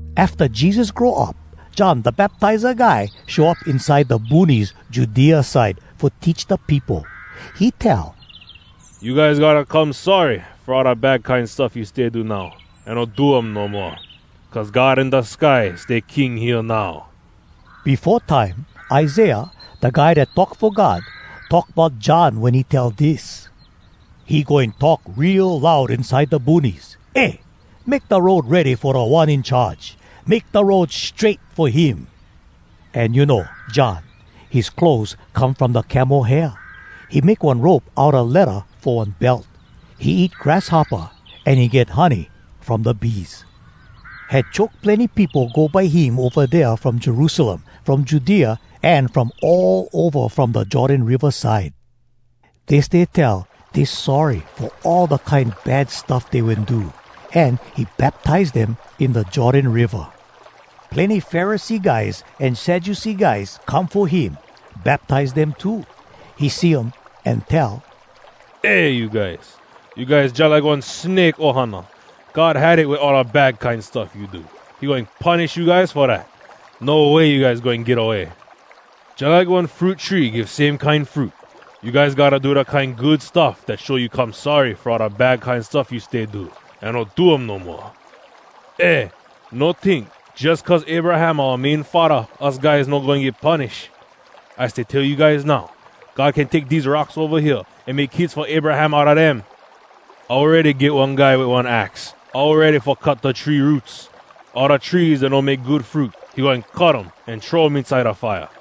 Afta Jesus grow up, John Da Baptiza Guy show up inside da boonies Judea side fo teach da peopo. He tell, “You guys gotta come sorry fo all da kine bad stuff you stay do now, an no do um no moa. Cuz God in da sky stay King hea now.” Befo time, Isaiah, da guy dat talk fo God, talk bout John wen he tell dis: “He goin talk real loud inside da boonies, ‘Eh! Make da road ready fo Da One In Charge! Make da road strait fo him!’” An you know, John, his clothes come from da camel hair. He make one rope outa ledda fo one belt. He eat grasshoppa, an he get honey from da bees. Had choke plenny peopo go by him ova dea from Jerusalem, from Judea, an from all ova from da Jordan Riva side. Dey stay tell dey sorry fo all da kine bad stuff dey wen do, an he baptize dem in da Jordan Riva. Plenny Pharisee guys an Sadducee guys come fo him baptize dem too. He see um, an tell, “Eh you guys! You guys jalike one snake ohana! God had it wit all da bad kine stuff you do. He goin punish you guys fo dat. No way you guys goin get away! Jalike one fruit tree give same kine fruit, you guys gotta do da kine good stuff dat show you come sorry fo do all da kine bad stuff you stay do, an no do um no moa. Eh! No tink, ‘Jus cuz Abraham oua main faddah us guy no goin get punish!’ I stay tell you guys now, God can take dese rocks ova hea an make kids fo Abraham outa dem. Awready get one guy wit one ax, all ready fo cut da tree roots. All da trees dat no make good fruit, he goin cut um, an throw um inside da fire.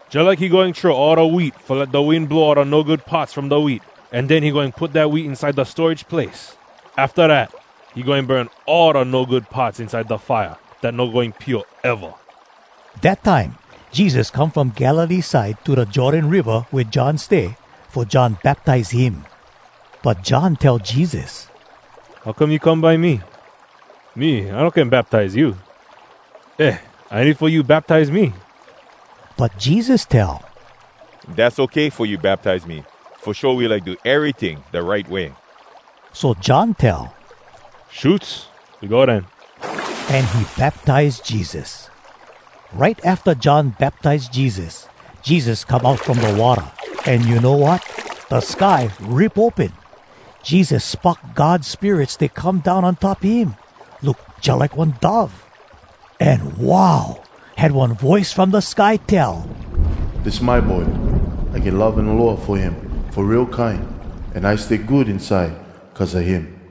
Jalike he goin throw all da wheat fo let da wind blow all da no good parts from da wheat, an den he goin put dat wheat inside da storage place. Afta dat, he goin burn all da no good parts inside da fire dat no goin pio eva.” Dat time, Jesus come from Galilee side to da Jordan Riva wea John stay, fo John baptize him. But John tell Jesus, “How come you come by me? Me, I no can baptize you. Eh, I need fo you baptize me!” But Jesus tell, “Dass okay fo you baptize me, fo show we like do eryting da right way.” So John tell, “Shoots, we go den.” An he baptize Jesus. Right afta John baptize Jesus, Jesus come out from da watta, an you know wat? Da sky rip open. Jesus spock God Spirit stay come down on top him. Look jalike one dove. An wow! Had one voice from da sky tell, “Dis my boy. I get love an aloha fo him fo real kine, an I stay good inside cuz a him!”